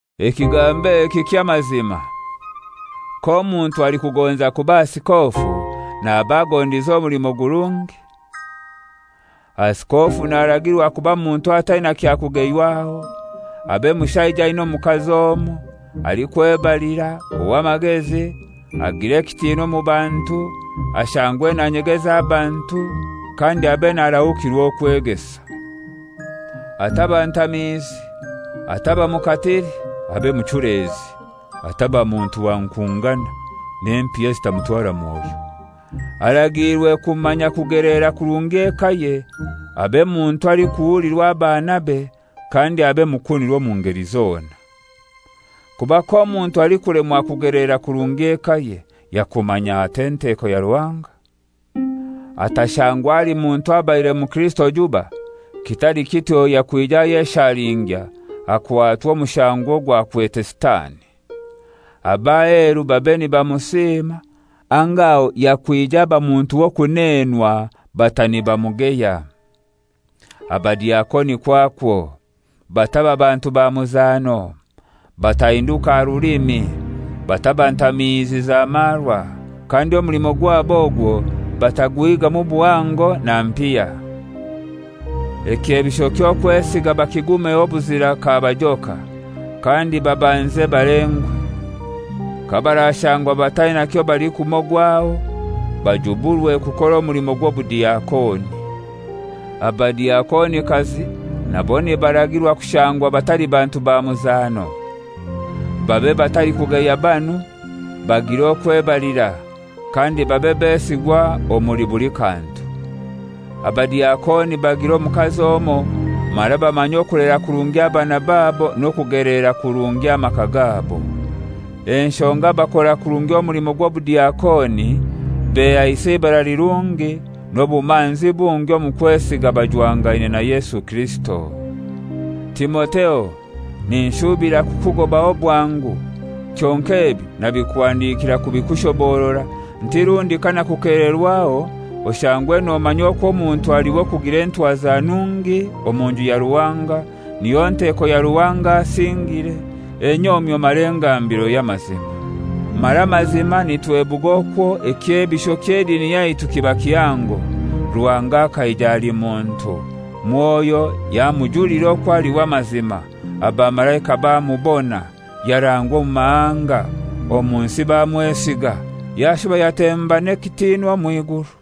Ekigambo eki ky'amazima: K'omuntu alikugonza kuba asikofu, naba agondize omulimo gurungi. Asikofu naragirwa kuba muntu ataina kya kugeywaho, abe mushaija aina omukazi omoi, alikwebalira, ow'amagezi, agire ekitinwa omu bantu, ashangwe nanyegeza abantu, kandi abe narahukirwa okwegesa. Ataba ntamiizi, ataba mukatili, abe muchulezi, ataba muntu wa nkungana, n'empiya zitamutwara mwoyo. Aragiirwe kumanya kugelera kurungi ekaye, abe muntu alikuhulirwa abanabe, kandi abe mukunirwa omu ngeli zona. Kuba k'omuntu alikulemwa kugelera kurungi ekaye, yakumanya atai enteko ya Ruhanga? Atashangwa ali muntu abaire mukirisito juba, kitali kityo yakwija ayeshalingya akwatwa omushango ogwakwete Sitani. Ab'aheru babe nibamusima, anga aho yakwija aba muntu w'okuneenwa bata nibamugeya. Abadiakoni kwakwo, bataba bantu ba muzano. Batahinduka aha rulimi, bataba ntamiizi za marwa, kandi omulimo gwabo ogwo bataguhigamu buhango na mpiya. Ekyebisho ky'okwesiga bakigumeho obuzira kabajoka. Kandi babanze balengwe. Kabarashangwa bataina kyobalikumogwaho, bajuburwe kukora omulimo gw'obudiakoni. Abadiakonikazi nabo nibargirwa kushangwa batali bantu ba muzano. Babe batalikugeya banu, bagire okwebalira, kandi babe besigwa omuli buli kantu. Abadiakoni bagire omukazi omoi, mara bamanye okulera kurungi abana babo n'okugeleera kurungi amaka gabo. Enshonga abakora kurungi omulimo gw'obudiakoni behaisa eibara lirungi n'obumanzi bungi omu kwesiga bajwangaine na Yesu Kirisito. Timotheo, ninshubira kukugobaho bwangu, kyonkai ebi nabikuhandikira kubikushoborora, nti rundi kanakukelererwaho oshangwe nomanya okwo omuntu ali w'okugira entwaza nungi omu nju ya Ruhanga, niyo nteko ya Ruhanga asingire, enyomyo mara engambiro y'amazima. Mara mazima nitwebuga okwo ekyebisho ky'edini yaitu kiba kihango: Ruhanga akaija ali muntu, Mwoyo yamujulira okwo ali w'amazima, abamalaika bamubona, yarangwa omu mahanga, omu nsi bamwesiga, yashuba yatemba n'ekitinwa omw'iguru.